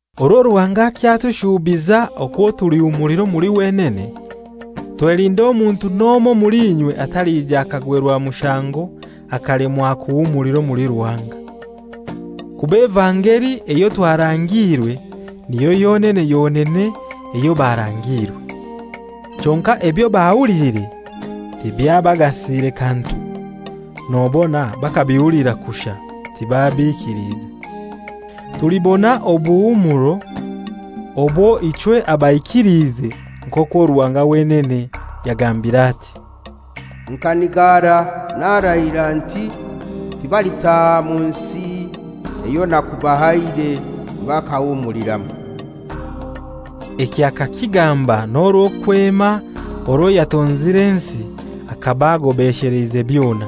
Orwo Ruhanga akyatushuubiza okwo tulihumulira omuli wenene, twelinde omuntu n'omoi omuli inywe atalija akagwerwa mushango akalemwa kuhumulira omuli Ruhanga. Kuba evangeli eyo twarangiirwe niyo yonene yonene eyo barangiirwe. Kyonkai ebyo bahuliire tibyabagasire kantu, nobona bakabihulira kushai, tibabikiliize. Tulibona obuhumuro obwo ichwe abaikiliize nk'okwo Ruhanga wenene yagambire ati, «Nkanigara narahira nti, ‹Tibalitaaha mu nsi eyo nakubahaire bakahumuliramu.›» Eki akakigamba n'orwo kwema orwo yatonzire ensi akaba agobesheleize byona.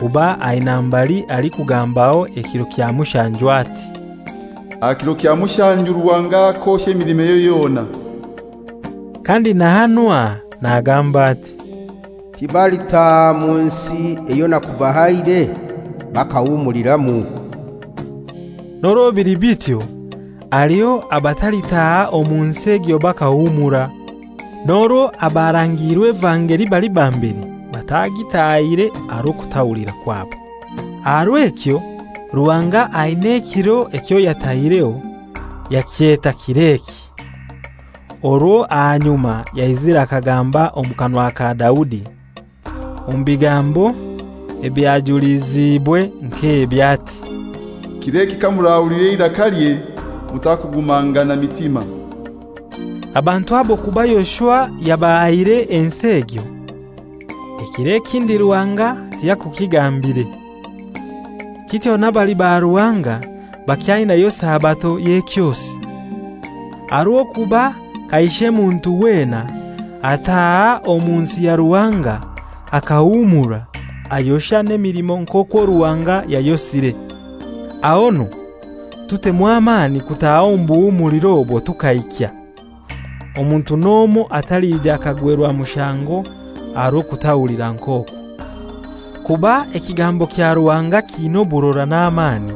Kuba aina mbali alikugambaho ekiro kya mushanju ati, «Aha kiro kya mushanju Ruhanga akosha emilimoye yona.» Kandi na hanu aha nagamba ati, «Tibalitaaha mu nsi eyo nakubahaire bakahumuliramu.» N'orwo bili bityo haliho abalitaaha omu nsi egyo bakahumura, n'orwo abarangiirwe evangeli bali ba mbere batagitahire aha rw'okutahulira kwabo. Aha rw'ekyo Ruhanga aina ekiro ekyo yataireho, yakyeta «Kir'eki,» orwo aha nyuma yaizire akagamba omu kanwa ka Daudi, omu bigambo ebyajuliziibwe nk'ebi ati, «Kir'eki kamurahulira eirakalye, mutakugumangana mitima.» Abantu abo kuba Yoshua yabahaire ensi egyo, ekiro ekindi Ruhanga tiyakukigambire. Kityo n'abali ba Ruhanga bakyainayo Sabato y'ekyosi. Aha rw'okuba kaishe muntu wena ataaha omu nsi ya Ruhanga akahumura, ayosha n'emilimo nk'okwo Ruhanga yayosire. Ahonu tutemu amani kutaaha omu buhumuliro obwo tukaikya, omuntu n'omoi atalija akagwerwa mushango aha rw'okutahulira nk'okwo. Kuba ekigambo kya Ruhanga kiina oburora n'amani,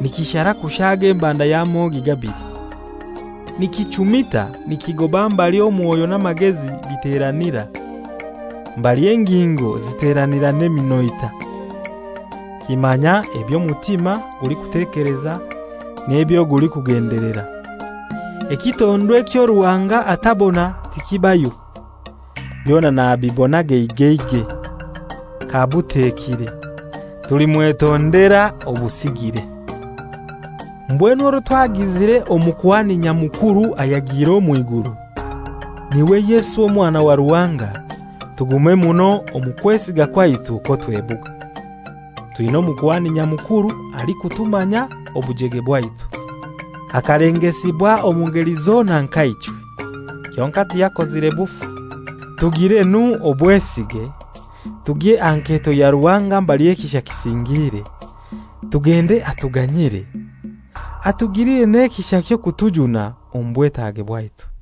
nikishara kushaaga embanda y'amogi gabili. Nikichumita nikigoba mbali omwoyo n'amagezi biteranira, mbali engingo ziteranira n'eminoita, kimanya eby'omutima gulikutekeleza n'ebyo gulikugendelera. Ekitondwa ekyo Ruhanga atabona tikibayo. Byona nabibona geigeigei, kabutekire. Tulimwetondera obusigire. Mbwenu orwo twagizire Omukuhani Nyamukuru ayagiire omw'iguru, n'iwe Yesu Omwana wa Ruhanga, tugume muno omu kwesiga kwaitu okwo twebuga. Twina Omukuhani Nyamukuru alikutumanya obujege bwaitu, akalengesibwa omu ngeli zona nka ichwe, kyonkai tiyakozire bufu. Tugiire nu obwesige, tugye aha nketo ya Ruhanga mbali ekisha kisingiire, tugende atuganyire, atugilire n'ekisha ky'okutujuna omu bwetage bwaitu.